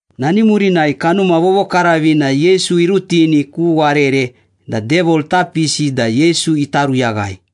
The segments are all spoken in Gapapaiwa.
Nani murinai Kanuma Vovokaravina Yesu irutini ku warere da Devil ita pisi da Yesu ita ruyaghai.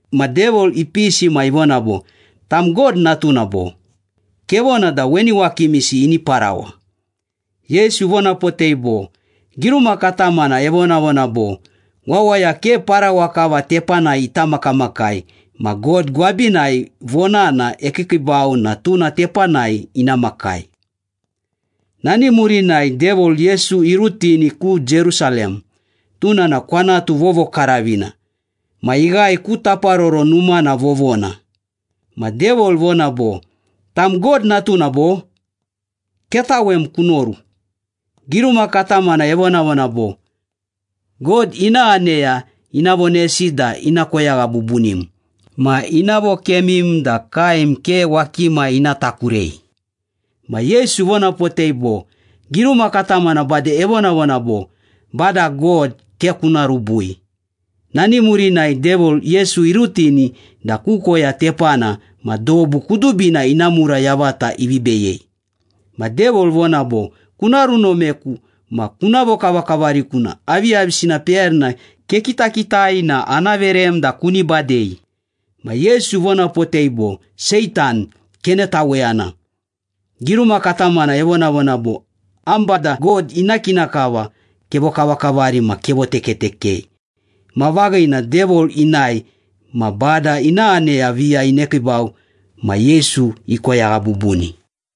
Ma Devil ipisi ma ivona bo, “Tam God natuna, bo? Kevona da weni wakimisi ini parawa.” Yesu ivonapotei bo, “Giruma katamana evonavona bo, ‘Wawaya ke parawa kava tepanai ita makamakai ma God gwabinai vonana ekiikiibau na tuna tepanai ina makai.’” Nani murinai Devil, Yesu irutini ku Jerusalem, tuna na kwanatu vovokaravina. Ma ighae ku Taparoro Numana vovona. Ma Devil ivona bo, “Tam God natuna, bo? Ketawem kunoru. Giruma katamana evonavona bo, ‘God ina aneya ina vonesi da ina koyagha bubunim, ma ina vokemim da kaem ke wakima ina takurei.’” Ma Yesu ivonapotei bo, “Giruma katamana bade evonavona bo, ‘Bada God ke kuna rubui.’” Nani murinai Devil, Yesu irutini da ku koya tepana ma dobu kudubina ina mura yavata ivi beyei. Ma Devil ivona bo, “Kuna runomeku ma kuna vokavakavariku na aviyavisina peyarina kekitakitika na ana verem da kuni badei.” Ma Yesu ivonapotei bo, “Seitan, kenetaweyana! Giruma katamana evonavona bo, ‘Am Bada God ina kina kava kevokavakavari ma kevotekatekei.’” Ma vaghina, Devil inae. Ma Bada ina aneya viya inekiibau ma Yesu ikoyagha bubuni.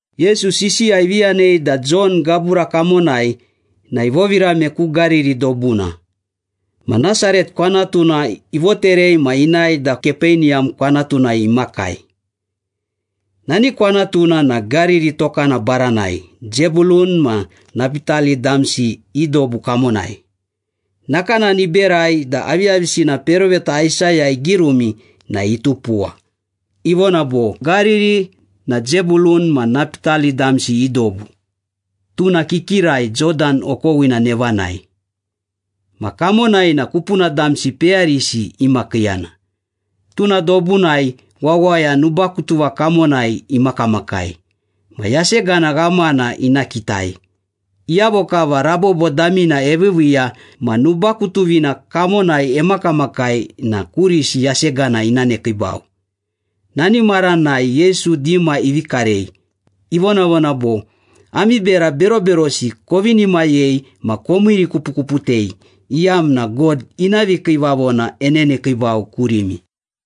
Yesu sisiya ivi yanei da Jon gabura kamonai na ivovirame ku Gariri dobuna. Ma Nasaret kwanatuna ivoterei ma inae da Kapeniyam kwanatunai imakai. Nani kwanatuna na Gariri tokana baranai, Zebulun ma Napitali damsi i dobu kamonai. Nakanani iberai da aviyavisina peroveta Aisaya igirumi na itupuwa, ivona bo, “Gariri na Zebulun ma Napitali damsi i dobu. Tuna kikirai, Jodan okowina nevanai, ma kamonai na kupuna damsi peyarisi imakiiyana. Tuna dobunai wawaya nubakutuva kamonai imakamakai, ma yasegana ghamana ina kitai. Iyavo kava rabobo damina eviiviiya ma nubakutuvina kamonai emakamakai na kurisi yasegana ina nekiibau.” Nani maranai Yesu dima ivi karei, ivonavona bo, “Ami bera beroberosi kovinimayei ma komiirikupukuputei, iyamna God ina vikiivavona enenekiibau kurimi.”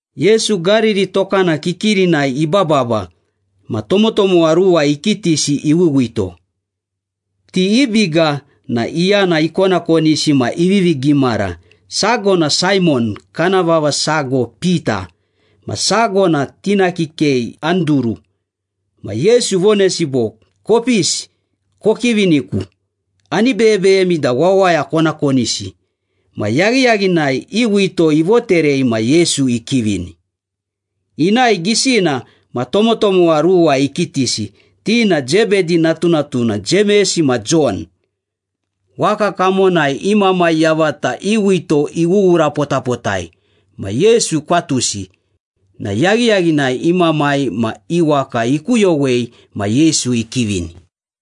Yesu Gariri tokana kikirinai ibababa ma tomotomowa ruwa ikitisi iwiwito. Ti i biga na iyana ikonakonisi ma ivivi gimara. Sago na Saimon (kana vava sago Pita) ma sago na tina kikei Anduru. Ma Yesu ivonesi bo, “Kopisi, kokiviniku. Ani beyebeyemi da wawaya kona konisi.” Ma yaghiyaghinai i wito ivoterei ma Yesu ikivini. Inae gisina ma tomotomowa ruwa ikitisi, ti na Zebedi natunatuna Jemes ma Jon. Waka kamonai i mamai yavata i wito iwuwurapotapotai ma Yesu ikwatusi na yaghiyaghinai i mamai ma i waka ikuyowei ma Yesu ikivini.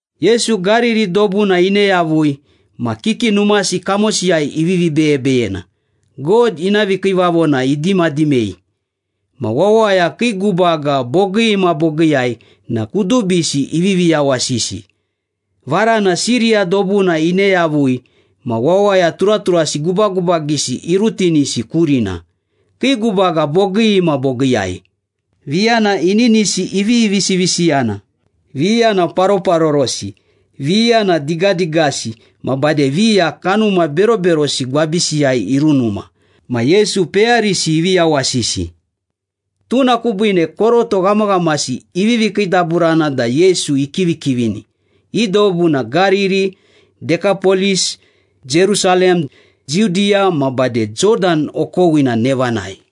Yesu Gariri dobuna ine yavui ma kiki numasi kamosiyai ivivi beyebeyena, God ina vikiivavona idimadimei. Ma wawaya kii gubaga bogii ma bogiiyai na kudubisi ivivi yawasisi. Varana Siriya dobuna ine yavui, ma wawaya turaturasi gubagubagisi irutinisi kurina. Kii gubaga bogii ma bogiiyai. Viya na ininisi ivivi visivisiyana, viya na paroparorosi, viya na digadigasi ma bade viya kanuma beroberosi gwabisiyai irunuma. Ma Yesu peyarisi ivi yawasisi. Tuna kubiine koroto ghamaghamasi ivivi kiidaburana da Yesu ikivikivini. I dobu na Gariri, Dekapolis, Jerusalem, Judiya ma bade Jodan okowina nevanai.